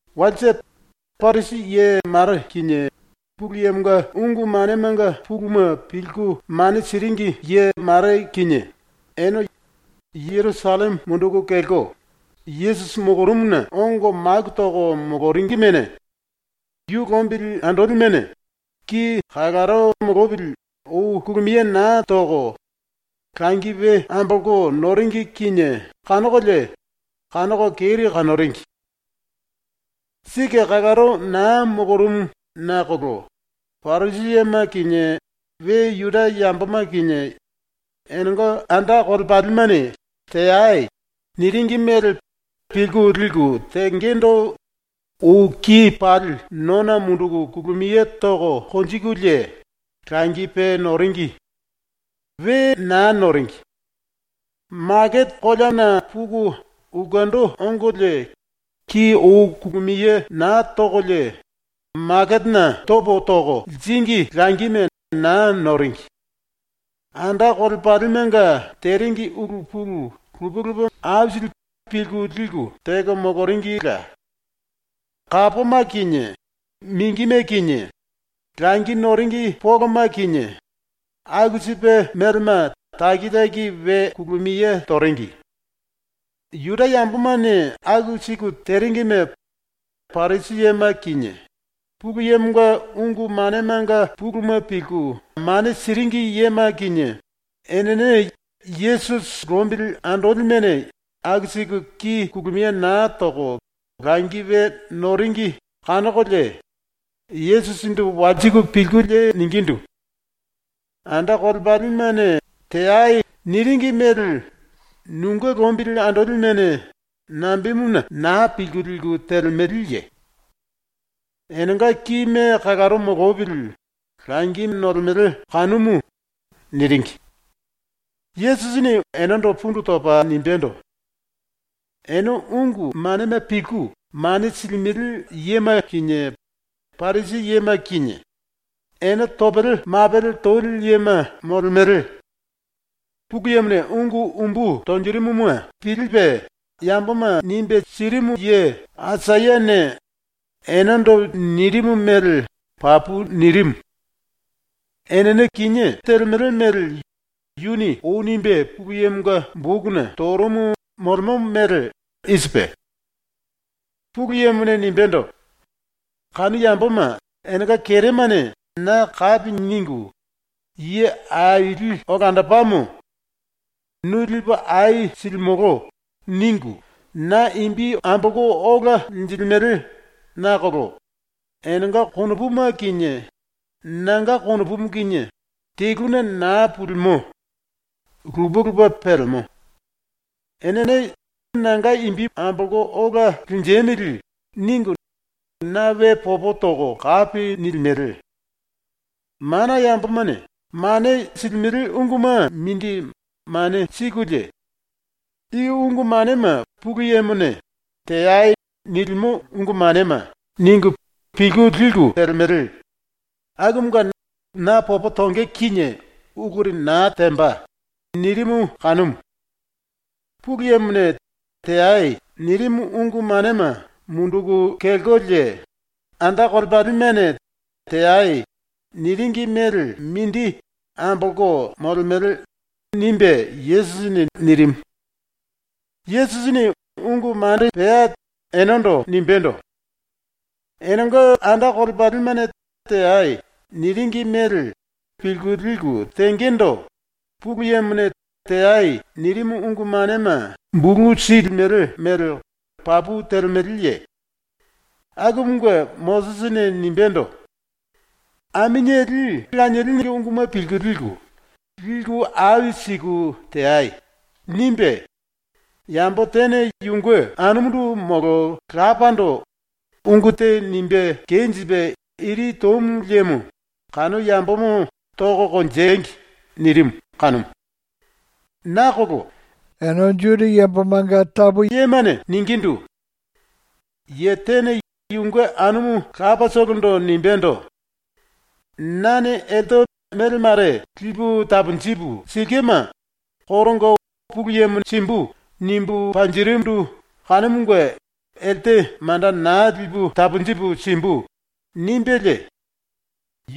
⸤Walse⸥ Parisi ye mare kinie Pulu Yemonga ungu manemanga puluma pilku mane siringi ye mare kinie ene Jerusalleme munduku kelko Yesusi molorumuna ongo maku toko moloringimene yu lombili andolimene ki kalaro molopili ou kulumiye naa toko langi we ambolko noringi kinie kanokolie kanoko keri kanoringi. (⸤Sike kalaro naa molorumu nakolo⸥ Parisi yema kinie we Juda yamboma kinie enenga anda kolepalimene “Teai.” niringi mele pilku liku tengendo ou ki pali nona munduku kulumiye toko konjikulie langi pe noringi. We naa noringi. Makete koleana puku ulkendo ongolie ki ou kulumiye naa tokolie ⸤maketena topo toko liringi⸥ langime naa noringi. Anda kolepalimenga teringi ulu pulu lupe lupe aisili pilku liku teko moloringila. Kápoma kinie, mingime kinie, langi noringi poloma kinie, aku sipe melema taki taki we kulumiye toringi.) ⸤Juda yambomane aku siku teringi⸥ ne Parisi yema kinie, Pulu Yemonga ungu manemanga puluma pilku mane siringi yema kinie, enene ⸤Yesusi lombili andolimene aku siku ki kulumiye naa toko langi we noringi kanokolie⸥ Yesusindu walsiku pilkulie ningindu: “Anda kolepalimene “Teai.” niringi mele nunge lombili andolimene nambemuna naa pilku liku telemeleye? Enenga kime kalaro molopili langi nolemele kanumu.” niringi. Yesusini enendo pundu topa nimbendo: “Ene ⸤ungu manema pilku mane silimele yema kinie Parisi yema kinie⸥ ene topele mapele toli yema molemele! Pulu Yemone ungu umbu tonjirimuma pilipe yamboma nimbe sirimu ye Aisayane enendo nirimu mele papu nirimu. ⸤Enene kinié telemele mele yuni ou nimbe Pulu Yemonga⸥ bokuna torumu molemo mele i sipe: ⸤Pulu Yemone nimbendo:⸥ “Kanu yamboma enenga keremane na kapi ningu ‘Ye aili olandopamo. Nu lipu ai silimolo.’ ningu na imbi ambolko ola linjilimele nakolo enenga konopuma kinie nanga konopumu kinie teluna naa pulimo. lupe lupe pelemo. Enene ‘Nanga imbi ambolopo ola linjemili.’ ningu na we popo toko kapi nilimele. Mana yambomane mane silimele unguma mindi mane sikulie ‘I ungu manema Pulu Yemone “Teai.” nilimo ungu manema.’ ningu pilku liku telemele, akumunge na popo tonge kinie uluri naa temba.” nirimu kanumu. Pulu Yemone “Teai.” nirimu ungu manema munduku kelkolie anda kolepalimene “Teai.” niringi mele mindi ambolko molemele.” ⸤nimbe Yesusini⸥ nirimu. ⸤Yesusini⸥ ungu mare pea enendo nimbendo: “Enenga anda kolepalimene “Teai.” niringi mele pilku liku tengendo Pulu Yemone “Teai.” nirimu ungu manema bulu silimele mele papu telemeleye? Akumunge Mosisini nimbendo: “Aminieli lanielinge unguma pilku liku, liku ai siku teai.” nimbe “Yambo tene yunge anumundu molo lapando ungu te nimbe kenjipe iri tomu liemo kanu yambomo toko konjengi.” nirimu kanumu. Nakolo ene yemane ningindu: “Ye tene yunge anumu lapatolondo nimbendo: “Nane elte mele mare lipu taponjipu silkema koronga ‘Pulu Yemo simbu.’ nimbu panjirindu kanumunge elte manda naa lipu taponjipu simbu.” nimbelie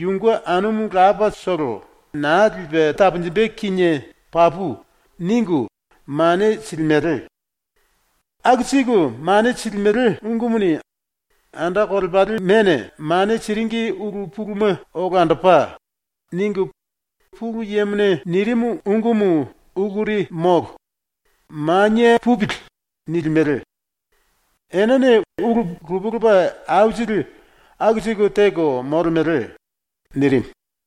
yunge anumu lapatolo naa lipe taponjimbe kinie papu.” ningu mane silimele. Aku siku mane silimele ungumuni ‘Anda kolepalimene mane siringi ulu puluma olandopa.’ ningu ‘Pulu Yemone nirimu ungumu uluri molo. Manie pupili.’ nilimele. Enene ulu lupe lupe aisili aku siku teko molemele.” nirimu.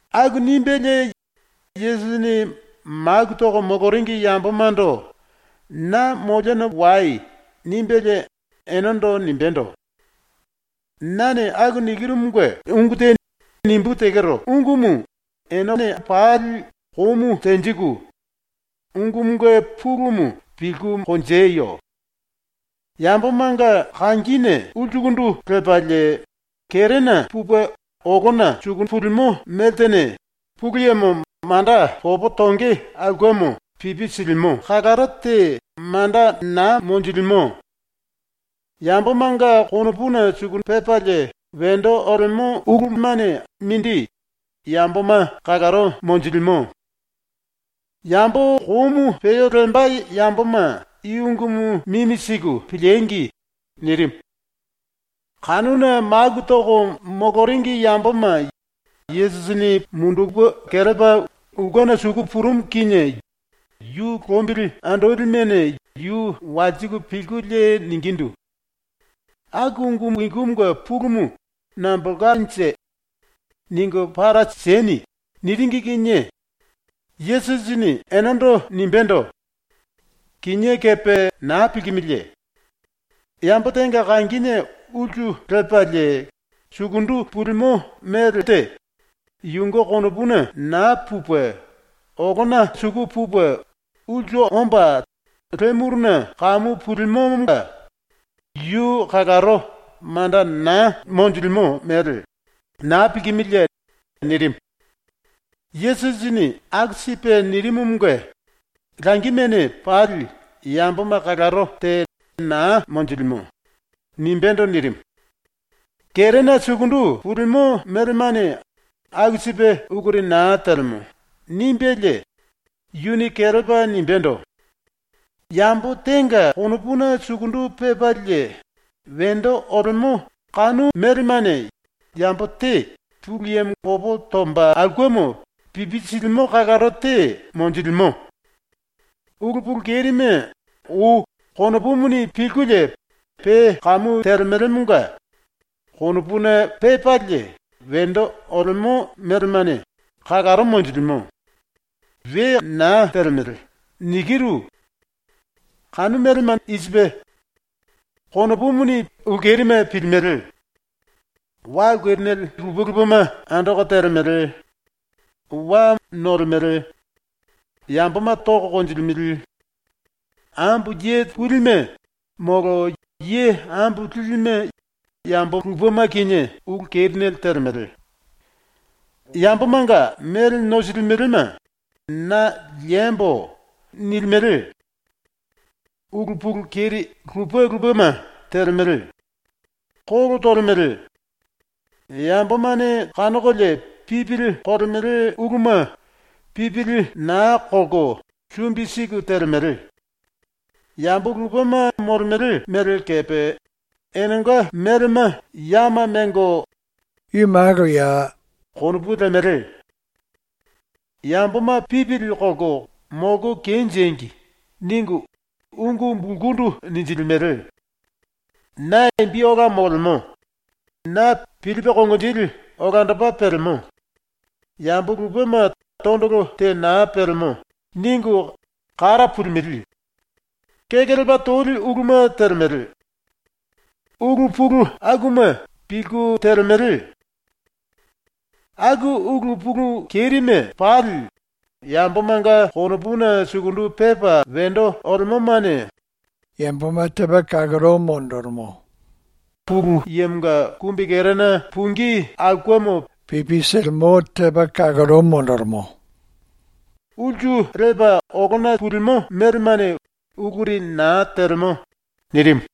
Aku nimbelie Yesusini maku toko moloringi yambomando “Na moliona wai.” nimbelie enendo nimbendo: “Nane ⸤aku nikirumunge ungu te⸥ nimbú tekero ungumu enene pali komu tenjiku ungumunge pulumu pilku konjeyo. Yambomanga kangine ulsukundu lepalie kerena pupe olona suku pulimo meltene ⸤Pulu Yemo manda popo tonge aulkemo pipi silimo⸥ kalaro te manda naa monjilimo. Yambomanga konopuna sukundu pepalie wendo olemo ulumane mindi yamboma kalaro monjilimo. (Yambo komu peo lemba yamboma i ungumu mimi siku piliengi!” nirimu.) Kanuna maku toko moloringi yamboma Yesusini mundupe kelepa ulkena suku purumu kinie yu lombili andolimene yu walsiku pilkulie ningindu: “Aku ungu ikumunge pulumu nambolkanje? Ningu para sieni.” niringi kinie Yesusini enendo nimbendo: “Kinié kepe naa pilkimiliye? Yambo tenga kangine ulsu lepalie sukundu pulimo melte yunge konopuna naa pupe, olona suku pupe ulsu omba le muruna kamu pulimomonga yu kalaro manda naa monjilimo mele naa pilkimiliye?” nirimu. (Yesusini aku sipe nirimumunge “Langimene pali yamboma kalaro te naa monjilimo.” nimbendo nirimu.) ⸤“Kerena sukundu pulimo melemane aku sipe uluri naa telemo.” nimbelie⸥ yuni kelepa nimbendo: “Yambo tenga konopuna sukundu pepalie wendo olemo kanu melemane yambo te ⸤Pulu Yemo popo tomba aulkemo pipi silimo⸥ kalaro te monjilimo. Ulu pulu kerime ou konopumuni pilkulie ⸤pe kamu telemelemonga⸥ “Konopuna pepalie wendo olemo melemane kalaro monjilimo. ⸤We naa telemele.⸥” ⸤nikiru.⸥ Kanu melema i sipe: konopumuni ulu kerime pilimele; wa ulu kerinele lupe lupema andoko telemele; wa nolemele; yamboma toko konjilimele; ambo ye pulime molo ye ambo lilime yambo lupema kinie ulu kerinele telemele; yambomanga mele nosilimelema ‘Na liembo.’ nilimele; ulu pulu keri lupe lupema telemele; kolo tolemele; yambomane kanokolie pipili kolemele uluma pipili naa kolko sumbi siku telemele, yambo lupema molemele mele kepe enenga melema yama mengo ‘Yu malo.’ konopu lemele; ‘Yamboma pipili kolko molko kenjengi!’ ningu ungu bulkundu ninjilimele; ‘Na imbi ola molemo. Na pilipe konginjili olandopa pelemo. Yambo lupema tondolo te naa pelemo.’ ningu kara pulimele; kekelepa toli uluma telemele; ulu pulu akuma pilku telemele. Aku ulu pulu kerime pali yambomanga konopuna sukundu pepa wendo olemomane yamboma ⸤Pulu Yemonga kumbikerena pungí aulkemo pipi silimo⸥ kalaro monjilimo. ⸤Ulsu lepa olona pulimo melemane uluri naa telemo⸥.” nirimu.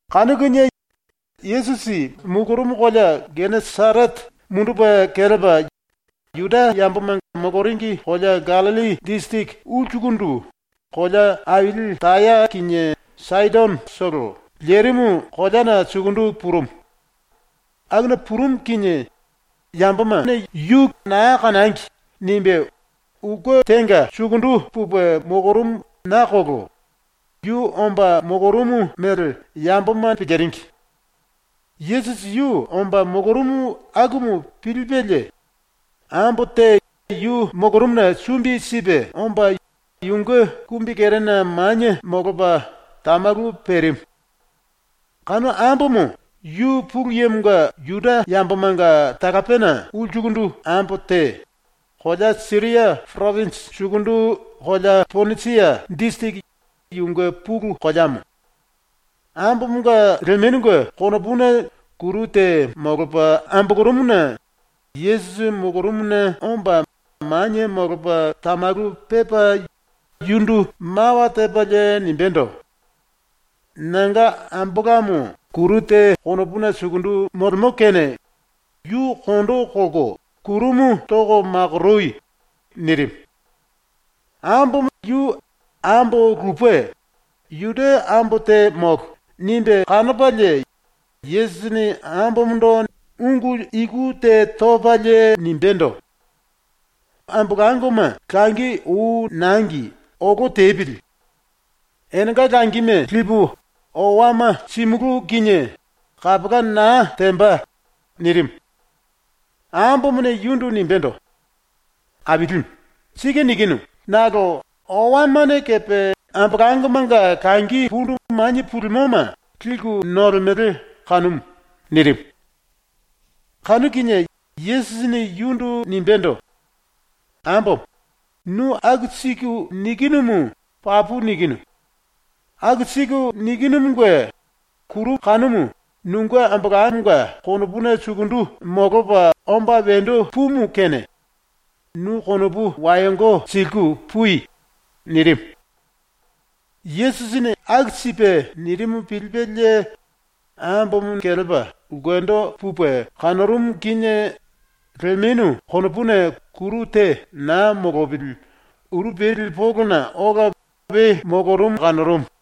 Kanu kinie Yesusi molorumu kolea ⸤Geneserete⸥ mundupe kelepa ⸤Juda yamboma moloringi kolea Gallilli disiriki ulsukundu⸥ kolea aili Taya kinie Saidonotolo lerimu koleana sukundu purumu. Akuna purumu kinie yu ‘Yamboma na naa kanangi.’ nimbe ulke tenga sukundu pupe molorumu nakolo yu omba molorumu mele yamboma piliringi. Yesusi yu omba molorumu akumu pilipelie ambo te yu molorumuna sumbi sipe omba yunge kumbikerena manie molopa tamalu perimu. Kanu ambomo yu ⸤Pulu Yemonga⸥ Juda yambomanga talapena ulsukundu ambo te, kolea Siria poropinji sukundu kolea Ponisia disiriki yunge pulu koleamo. Ambomonga lemenunge konopuna kuru te molopa ambolorumuna Yesusi molorumuna omba manie molopa tamalu pepa yundu mawa tepalie nimbendo: “Nanga ambolamo kuru te konopuna sukundu molemo kene yu ⸤kondo kolko⸥ kurumu toko makoroi.” nirimu. ⸤Ambomo yu ambo lupe, Juda ambo te molo, nimbe kanopalie⸥ Yesusini ambomondo ⸤ungu iku te topalie⸥ nimbendo: “Ambolangoma langi ou nangi olo tepili. Enenga langime lipu owama simulú kinie kapola naa temba.” nirimu. Ambomone yundu nimbendo: “Ailimu, sike nikinu nakolo owamane kepe ambolangomanga langi pundu manie pulimoma liku nolemele kanumu.” nirimu. Kanu kinie Yesusini yundu nimbendo: “Ambomo, nu aku siku nikinumu papu nikinu. Aku siku nikinumunge kuru kanumu nunge ambolamonga konopuna sukundu molopa omba wendo pumu kene nu ⸤konopu wayongo siliku⸥ pui.” nirimu. ⸤Yesusini aku sipe nirimu pilipelie⸥ ambomo kelepa ulkendo pupe kanorumu kinie lemenu konopuna kuru te naa molopili uru peli polona ola we molorumu kanorumu.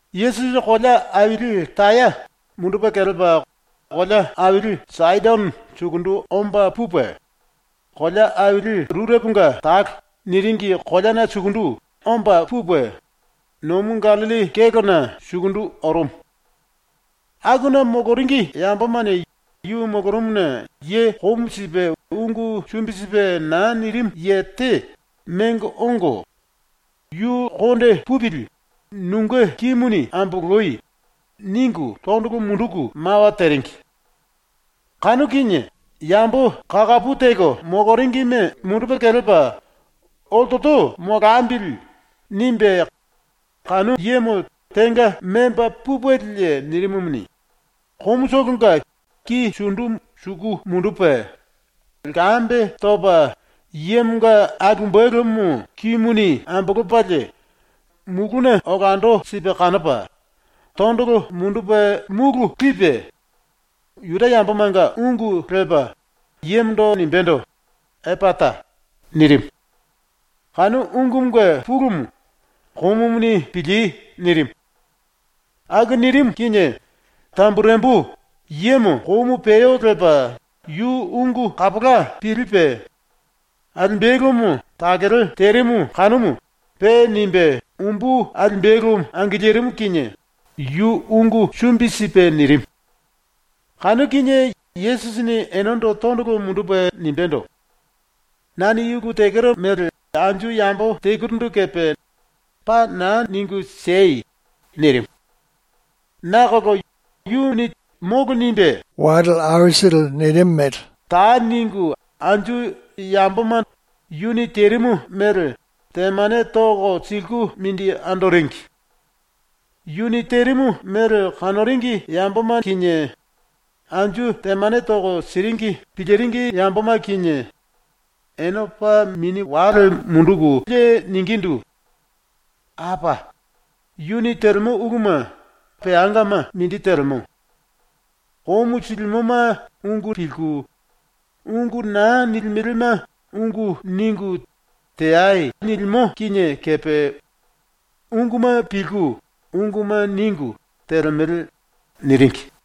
Yesusi kolea aili Taya mundupe kelepa kolea aili Saidono sukundu omba pupe, ‘Kolea Aili Rureponga Talo’ niringi koleana sukundu omba pupe, nomu Gallilli kélona ⸤sukundu⸥ orumu. Akuna moloringi yambomane yu molorumuna ye komu sipe ungu sumbi sipe naa nirimu ye te mengo ongo “⸤Yu konde pupili⸥ nunge kimuni amboloi.” ningu tondolo munduku mawa teringi. Kanu kinie yambo kakapu teko moloringime mundupe kelepa “Oltolo molambili.” nimbe kanu yemo tenga memba pupelie nirimumuni, komutolonga ki sundu suku mundupe, lkambe topa yemonga alimbelumu kimuni ambolopalie, mulúna olando sipe kanopa, tondolo mundupe múlu lipe, Juda yambomanga ungu lepa yemondo nimbendo: “Epata!” nirimu. (Kanu ungumunge pulumu “Komumuni pilí!” nirimu.) Aku nirimu kinie tamburembu yemo komu peo lepa yu ungu kapola pilipe, alimbelumu takele terimu kanumu pe nimbe umbu alimbelu angilirimu kinie yu ungu sumbi sipe nirimu. Kanu kinie Yesusini enendo tondolo mundupe nimbendo: “Nane i ulu tekero mele anju yambo telurindu kepe paa naa ningu siei!” nirimu. Nakolo yu “Molo.” nimbe karaye terimu mele ta ningu anju yamboma yuni terimu mele temane toko siliku mindi andoringi. ⸤Yu terimu mele kanoringi yamboma kinie, anju temane toko siringi piliringi yamboma kinie⸥ ene paa mini wale munduku suru ningulie ningindu: “Apa! Yu telemo uluma peangama mindi telemo. “Komu silimoma ungu pilku, ungu naa nilimelema ungu ningu, teai.” nilimo kinie kepe unguma pilku unguma ningu telemele.” niringi.